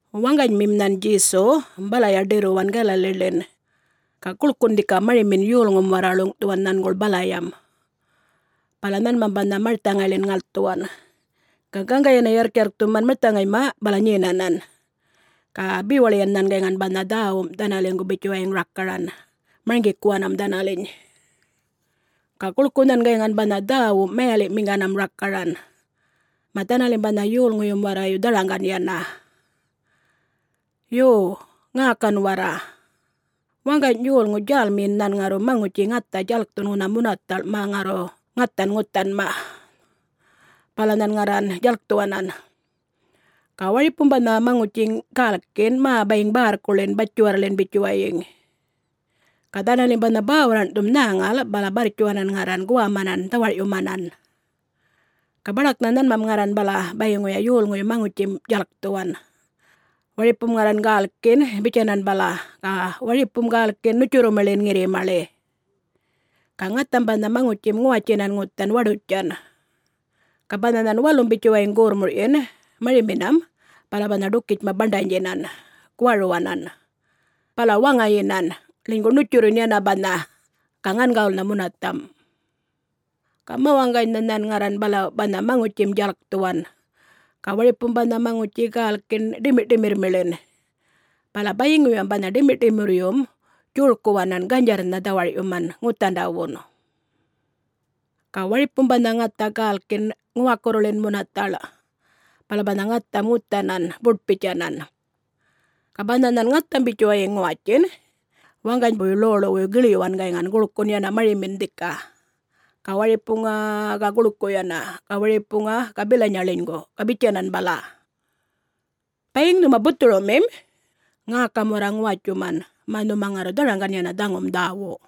Waŋganymim nhan Djesu balaya ḏirruwan Galaliḻin. Ga guḻkun dhika marimin yolŋum warra ḻuŋꞌthuwan nhanguḻ balayam. Bala nhanmam banha marthaŋayḻin ŋalthuwan, ga gaŋga yana yarrkyarrkthuman marthaŋayma, bala nyenanan ga bewaḻiyan nhan gayŋan banha dhäwum dhanaliŋgu bitjuwayiŋ rakaran, marŋgikuwanam dhanaliny. Ga guḻku nhan gayŋan banha dhäwum mayaliꞌmiŋganam rakaran, mä dhanalim banha yolŋuyum warrayu dharaŋgan yana. “Yo, ŋäkan warra: Waŋgany yolŋu djälmiyin nhan ŋarru maŋutji ŋatha djalkthun ŋunha munathaḻꞌ mä ŋarru ŋathan ŋuthanma. Bala nhan ŋarran djalkthuwanan. Ga waripum banha maŋutji gälkin mä bayiŋ bärrkuḻin, batjiwarrḻin bitjuwayiŋ. Ga dhanalim banha bäwarraṉ'thum nhäŋal bala barrtjuwanan ŋarran guwamanan dhawar'yumanan. Ga baḏaknha nhanmam ŋarran bala bayiŋuya yolŋuyum maŋutjim djalkthuwan, waripum ŋarran gälkin bitjanan bala, ga waripum gälkin ṉutjurrumiḻin ŋirrimaḻi. Ga ŋatham banha maŋutjim ŋuwatjinan ŋuthan waḏutjan, ga banha nhan walum bitjuwayiŋ gorrmurꞌyin mariminam bala banha ḏukitjma baṉḏanydjinan, guwaruwanan, bala waŋayinan, ḻinygu ṉutjurrun yana banha, ga ŋangawulnha munathamꞌ. Ga mawaŋganynha nhan ŋarran bala banha maŋutjim djalkthuwan, ga waripum banha maŋutji gälkin ḏimirrꞌṯimirrmiḻin. Bala bayiŋuyam banha ḏimirrꞌṯimirryum djorkuwanan, ganydjarrnha dhawarꞌyuman ŋuthandawun. Ga waripum banha ŋatha gälkin ŋuwakurruḻin munathaḻꞌ. Bala banha ŋatham ŋuthanan buṯ-bitjanan. Ga banha nhan ŋatham bitjuwayiŋ ŋuwatjin, waŋganybuy ḻoḻuwuy giḻyuwanan gayŋan guḻkun yana marimin dhika. Ga waripuŋa-a-a ga guḻku yana, ga waripuŋa ga bilanya ḻinygu, ga bitjanan bala. Bayiŋ nhuma buthurumim, ŋäkam warra ŋuwatjuman, mä nhuma ŋarru dharaŋgan yana dhaŋum dhäwu.”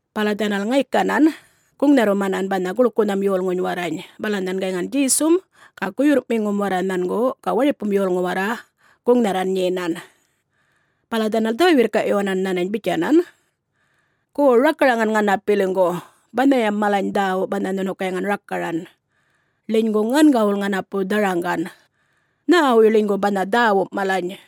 Bala dhanal ŋaykanan guŋnharrumanan banha guḻkunham yolŋuny warrany. Bala nhan gayŋan Djesum ga guyurrꞌmiŋum warra nhangu, ga waripum yolŋu warra guŋnharran nyenan. Bala dhanal dhä-wirrkaꞌyuwanan nhanany bitjanan, “Gu rakaraŋan ŋanapiliŋgu banhayam malany dhäwu banha nhunu gayŋan rakaran, ḻinygu ŋangawul ŋanapu dharaŋgan. Nhäwuy ḻinygu banha dhäwum malany?”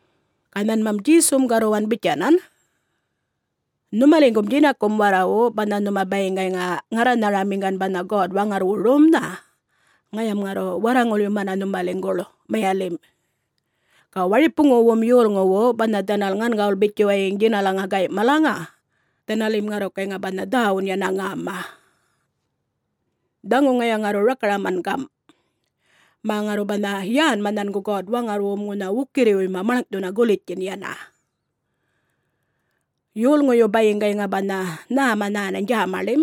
Ga nhanmam Djesum garruwan bitjanan, “Nhumaliŋgum djinakum warrawu banha nhuma bayiŋ gayŋa ŋarranharamiŋgan banha God-Waŋarrwu romnha, ŋayam ŋarru warraŋulyumana nhumaliŋguḻ mayalimꞌ. Ga waripuŋuwum yolŋuwu banha dhanal ŋangawul bitjuwayiŋ djinalaŋa gayꞌ malaŋa, dhanalim ŋarru gayŋa banha dhäwun yana ŋäma. Dhaŋu ŋaya ŋarru rakaraman gamꞌ, mä ŋarru banha yänma nhangu God-Waŋarrwum ŋunha wukirriwuyma maḻŋꞌthuna gulitjtjin yana: ‘Yolŋuyum bayiŋ gayŋa banha nhäma nhänany djämaḻim,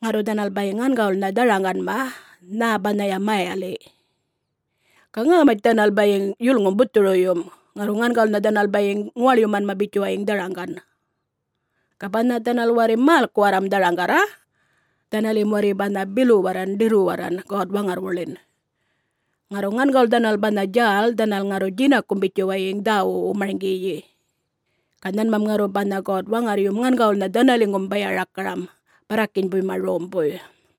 ŋarru dhanal bayiŋ ŋangawulnha dharaŋganma, nhä banhaya mayaliꞌ. Ga ŋämatj dhanal bayiŋ yulŋum buthuruyum, ŋarru ŋangawulnha dhanal bayiŋ ŋuwaḻyumanma bitjuwayiŋ dharaŋgan. Ga banha dhanal warri mälkuwarram dharaŋgarra, dhanalim warri banha biluwarran ḏirruwarran God-Waŋarrwuḻin. Ŋarru ŋangawul dhanal banha djäl dhanal ŋarru djinakum bitjuwayiŋ dhäwuꞌwu marŋgiyi. Ga nhanmam ŋarru banha God-Waŋarryum ŋangawulnha dhanaliŋgum baya-rakaramam barrakinybuyma rombuy.’”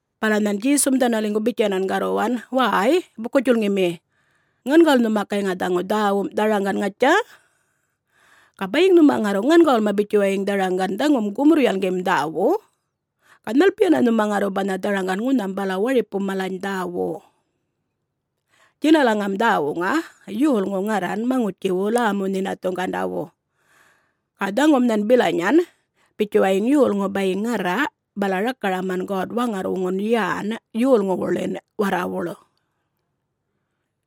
Bala nhan Djesum dhanaliŋgu bitjanan garruwan, “Wäy, buku-djulŋimi, ŋangawul nhuma gayŋa dhaŋu dhäwum dharaŋgan, ŋatja? Ga bayiŋ nhuma ŋarru ŋangawulma bitjuwayiŋ dharaŋgan dhaŋum gumurr-yalŋgim dhäwu, ga nhalpiyana nhuma ŋarru banha dharaŋgan ŋunham bala waripum malany dhäwu? Djinalaŋam dhäwuŋa, yolŋu ŋarran maŋutjiwu lämu-nhinathuŋgandawu. Ga dhaŋum nhan bilanyan, bitjuwayiŋ yolŋu bayiŋ ŋarra bala rakaraman God-Waŋarrwuŋun yän yolŋuwuḻin warrawuḻ.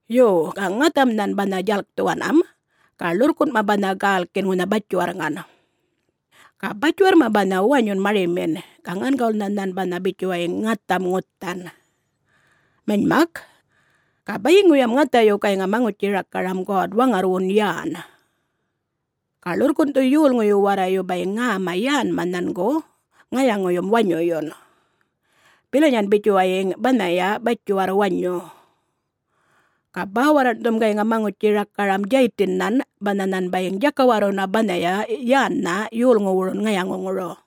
Yo, ga ŋatham nhan banha djalkthuwanam, ga ḻurrkunꞌma banha gälkin ŋunha batjiwarrŋan. Ga batjiwarrma banha wanyun marimin ga ŋangawulnha nhan banha bitjuwayiŋ ŋatham ŋuthan. Manymak, ga bayiŋuyam ŋathayu gayŋa maŋutji-rakaram God-Waŋarrwuŋun yän. Ga ḻurrkunꞌthu yolŋuyu warrayu bayiŋ ŋäma yänma nhangu ŋayaŋuyum wanyuyun, bilanyan bitjuwayiŋ banhaya batjiwarr wanyu. Ga bäwarraṉꞌthum gayŋa maŋutji-rakaram Djaytinnhan banha nhan bayiŋ djakawarruna banhaya yännhan yolŋuwurun ŋayaŋuŋuru.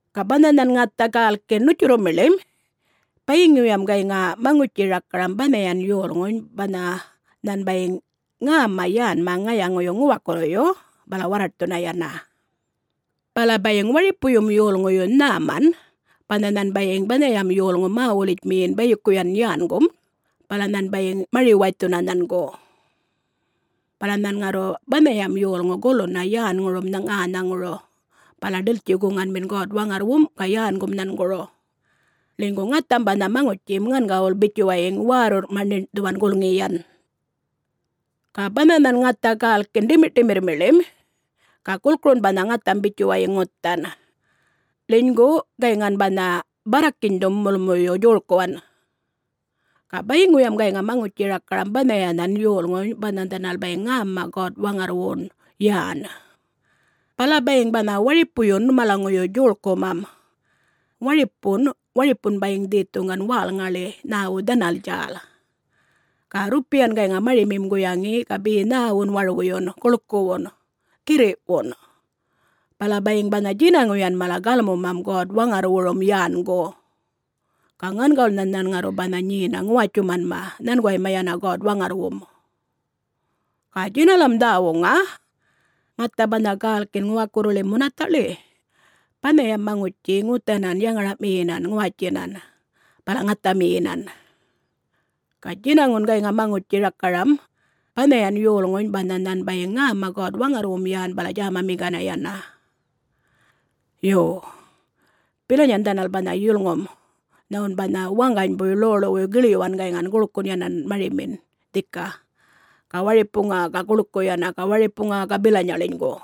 Ga banha nhan ŋatha gälkin ṉutjurrumiḻim, bayiŋuyam gayŋa maŋutji-rakaram banhayan yolŋuny banha nhan bayiŋ ŋäma yänma ŋayaŋuyu ŋuwakurruyu bala warraṯthuna yana. Bala bayiŋ waripuyum yolŋuyu nhäman banha nhan bayiŋ banhayam yolŋu mä-wulitjmiyin bayikuyan yängun, bala nhan bayiŋ mari-waythuna nhangu. Bala nhan ŋarru banhayam yolŋum guluna yänŋurum ŋänhaŋuru bala ḏiltji-guŋanmin God-Waŋarrwum ga yängum nhanguru, ḻinygu ŋatham banha maŋutjim ŋangawuḻ bitjuwayiŋ wärrurrꞌma ṉiṉꞌthuwan gulŋiyan. Ga banha nhan ŋatha gälkin ḏimirrꞌṯimirrmiḻim, ga gulkurun banha ŋatham bitjuwayiŋ ŋuthan, ḻinygu gayŋan banha barrakinydhun mulmuyum djorkuwan. Ga bayiŋuyam gayŋa maŋutji-rakaram banhayanhan yolŋuny banha dhanal bayiŋ ŋäma God-Waŋarrwum yän, bala bayiŋ banha waripuyun malaŋuyu djorkumam. Waripun, waripun bayiŋ dhethuŋgan wälŋaḻi, nhäwu dhanal djäl. Ga rrupiyan gayŋa marimim guyaŋi ga be nhäwun warwuyun, guḻkuwun, girriꞌwun. Bala bayiŋ banha djinaŋuyan mala galmuman God-Waŋarrwurum yängu, ga ŋangawulnha nhan ŋarru banha nyena ŋuwatjumanma nhanguwayma yana God-Waŋarrwum. Ga djinalam dhäwuŋa, ŋatha banha gälkin ŋuwakurruḻim munathaꞌḻi, banhayam maŋutji ŋuthanan yaŋaraꞌmiyinan ŋuwatjinan, bala ŋathamiyinan. Ga djinaŋum gayŋa maŋutji-rakaram banhayan yolŋuny banha nhan bayiŋ ŋäma God-Waŋarrwum yän bala djämamiŋgana yana. Yo, bilanyan dhanal banha yulŋum nhawun banha waŋganybuy ḻoḻuwuy giḻyuwanan gayŋan guḻkun yana marimin dhika. Ga waripuŋa-a-a ga guḻku yana, ga waripuŋa ga bilanya ḻinygu.”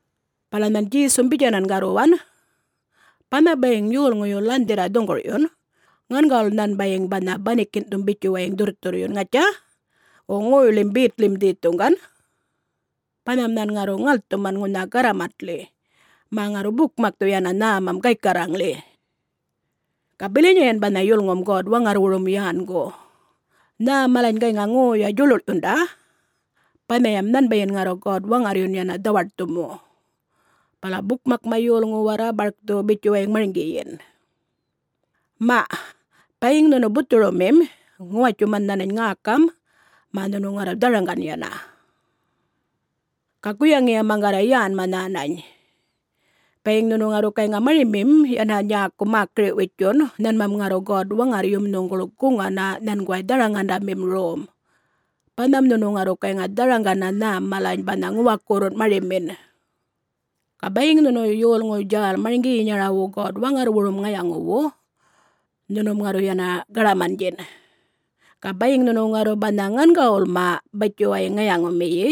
Bala nhan Djesum bitjanan garruwan, “Banha bayiŋ yolŋuyu lanhdhirra dhuŋgurꞌyun, ŋangawul nhan bayiŋ banha banikinꞌthum bitjuwayiŋ dhurrthurryun, ŋatja?... wo ŋoyḻim betḻim dhethuŋgan. Banham nhan ŋarru ŋalthuman ŋunha garramatḻi, mä ŋarru bukmakthu yana nhämam gaykarraŋḻi. Ga bilanyayan banha yulŋum God-Waŋarrwurum yängu. Nhä malany gayŋa ŋoya djuḻuḻyunda, banhayam nhanbayin ŋarru God-Waŋarryun yana dhawaṯthumu, bala bukmakma yolŋu warra barkthu bitjuwayiŋ marŋgiyin. Maꞌ, bayiŋ nhunu buthurumim ŋuwatjuman nhänany ŋäkam mä nhunu ŋarru dharaŋgan yana. Ga guyaŋiya maŋgarra yänma nhänany. Bayiŋ nhunu ŋarru gayŋa marimim yana nyäku mäkiri-witjun, nhanmam ŋarru God-Waŋarryum nhuŋguḻ guŋana nhanguway dharaŋandamim rom, banham nhunu ŋarru gayŋa dharaŋgana nhäm malany banha ŋuwakurrum marimim. Ga bayiŋ nhunu yolŋu djäl marŋgiyinyarawu God-Waŋarrwurum ŋayaŋuwu, nhunum ŋarru yana gaḏamandjin. Ga bayiŋ nhunu ŋarru banha ŋangawulma bitjuwayiŋ ŋayaŋumiyi,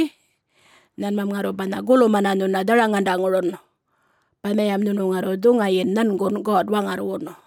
nhanmam ŋarru banha gulumana nhuna dharaŋandaŋurun, banhayam nhunu ŋarru dhuŋayin nhangun God-Waŋarrwun.”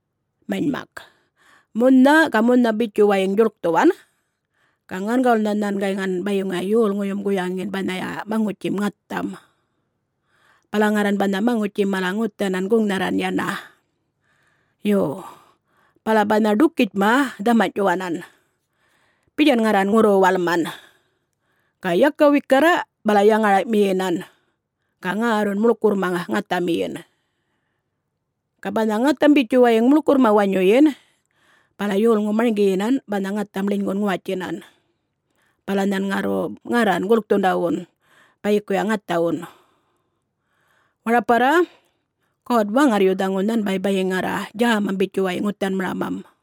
Manymak, munha ga munha bitjuwayiŋ djuḻkthuwan ga ŋangawulnha nhan gayŋan bayiŋuya yolŋuyum guyaŋin banhaya maŋutjim ŋatham. Bala ŋarran banha maŋutjim mala ŋuthanan guŋnharran yana. Yo, bala banha ḏukitjma dhamanyꞌtjuwanan, bitjan ŋarran ŋurru-walman. Ga yaka wikarra, bala yaŋaraꞌmiyinan, ga ŋärrun muḻkurrma ŋathamiyin. Ga banha ŋatham bitjuwayiŋ muḻkurrma wanyuyin, bala yolŋum marŋgiyinan banha ŋatham ḻinygun ŋuwatjinan, bala nhan ŋarru ŋarran gulkthundawun bayikuya ŋathawun. Waraparra, God-Waŋarryu dhaŋu nhanbay bayiŋ ŋarra djämam bitjuwayiŋ ŋuthanmaramam.”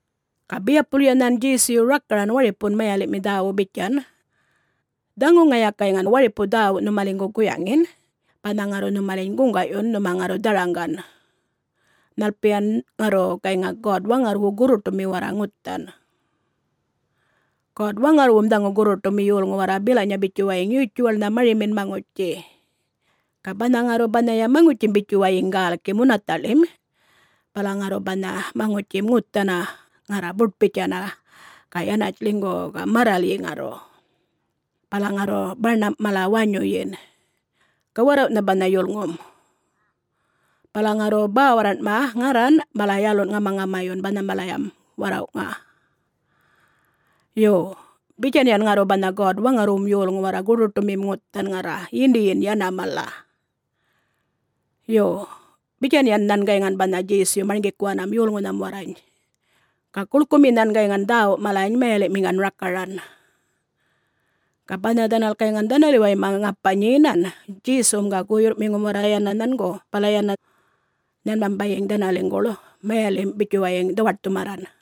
Ga biyapulya nhan Djesuyu rakaran waripun mayaliꞌmi dhäwu bitjan, “Dhaŋu ŋaya gayŋan waripu dhäwu nhumaliŋgu guyaŋin, banha ŋarru nhumaliny guŋgaꞌyun nhuma ŋarru dharaŋgan, nhalpiyan ŋarru gayŋa God-Waŋarrwu gurruṯumi warra ŋuthan. God-Waŋarrwum dhaŋu gurruṯumi yolŋu warra bilanya bitjuwayiŋ yutjuwaḻnha marimin maŋutji. Ga banha ŋarru banhaya maŋutjim bitjuwayiŋ gälki munathaꞌḻim bala ŋarru banha maŋutjim ŋuthana ŋarra buṯ-bitjana ga yanatj ḻinygu ga marralyi ŋarru, bala ŋarru baṉamꞌ mala wanyuyin. Ga warrawꞌnha banha yulŋum. Bala ŋarru bäwarraṉꞌma ŋarran bala yalunꞌ ŋamaŋamayun banhalayam warrawꞌŋa. Yo, bitjanyan ŋarru banha God-Waŋarrwum yolŋu warra gurruṯumim ŋuthan ŋarra, yindiyin yana mala.” Yo, bitjanyan nhan gayŋan banha Djesuyu marŋgikuwanam yolŋunham warrany. Ga guḻkumi nhan gayŋan dhäwu malany mayaliꞌmiŋgan rakaran. Ga banha dhanal gayŋan dhanaliwayma ŋapa nyenan, Djesum ga guyurrꞌmiŋum warra yana nhangu, nhanmam bayiŋ dhanaliŋguḻ mayalimꞌ bitjuwayiŋ dhawaṯthumarran.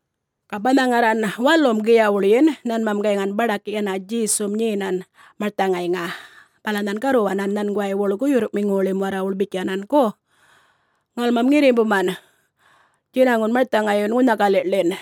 Ga banha ŋarran walum giyawuḻyin nhanmam gayŋan baḏak yana Djesum nyenan marthaŋayŋa. Bala nhan garruwanan nhanguwaywuḻ guyurrꞌmiŋuwuḻim warrawuḻ bitjanan, “Gu, ŋalmam ŋirrimbuman djinaŋun marthaŋayyun ŋunha galiꞌḻin.”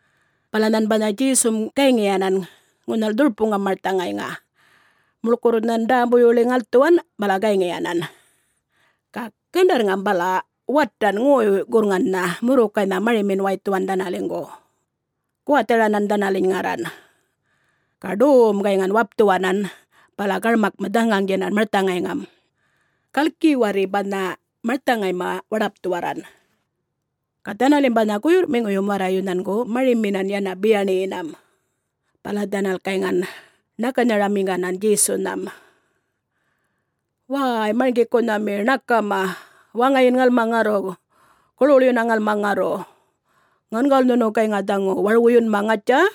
Bala nhan banha Djesum gayŋiyanan ŋunhal dhurpuŋam marthaŋayŋa, muḻkurr nhan ḏämbuwuyḻi ŋalthuwan bala gayŋiyanan. Ga gandarrŋam bala watan ŋoy-gurrŋanꞌnha murrukaynha marimin waythuwan dhanaliŋgu, guwatharanan dhanaliny ŋarran, ga ḏowum gayŋan wapthuwanan bala garmakma dhaŋaŋdjinan marthaŋayŋam, gaḻki warri banha marthaŋayma waḏapthuwarran. Ga dhanalim banha guyurrꞌmiŋum warra nhangu mariminan yana biyaṉiyinam, bala dhanal gayŋan ṉakaranharamiŋganan Djesunham, “Wäy Marŋgikunhami ṉakama, waŋayin ŋalma ŋarru, guḻwuḻyuna ŋalma ŋarru,... ŋangawul nhuna gayŋa dhaŋu warwuyunma, ŋatja?”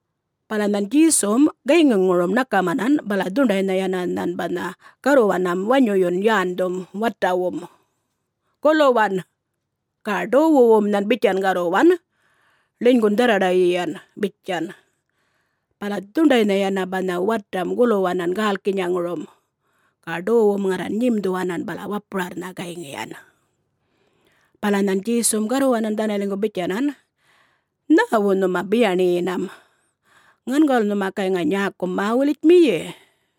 Bala nhan Djesum gayŋiŋurum ṉakamanam bala dhuṉḏaynha yana nhan garruwanam wanyuyun yändhum watawum, “Guluwan!” ga ḏowuwum nhan bitjan garruwan, “Ḻinygun dharraḏayiyan!” bitjan. Bala dhuṉḏaynha yana banha watam guluwanan gälkinyaŋurum ga ḏowum ŋarran nyimdhuwanan bala wapurarrnha gayŋiyan. Bala nhan Djesum garruwanan dhanaliŋgu bitjanan, “Nhäwu nhuma biyaṉiyinam?... ŋangawul nhuma gayŋa nyäkum mä-wulitjmiyi?”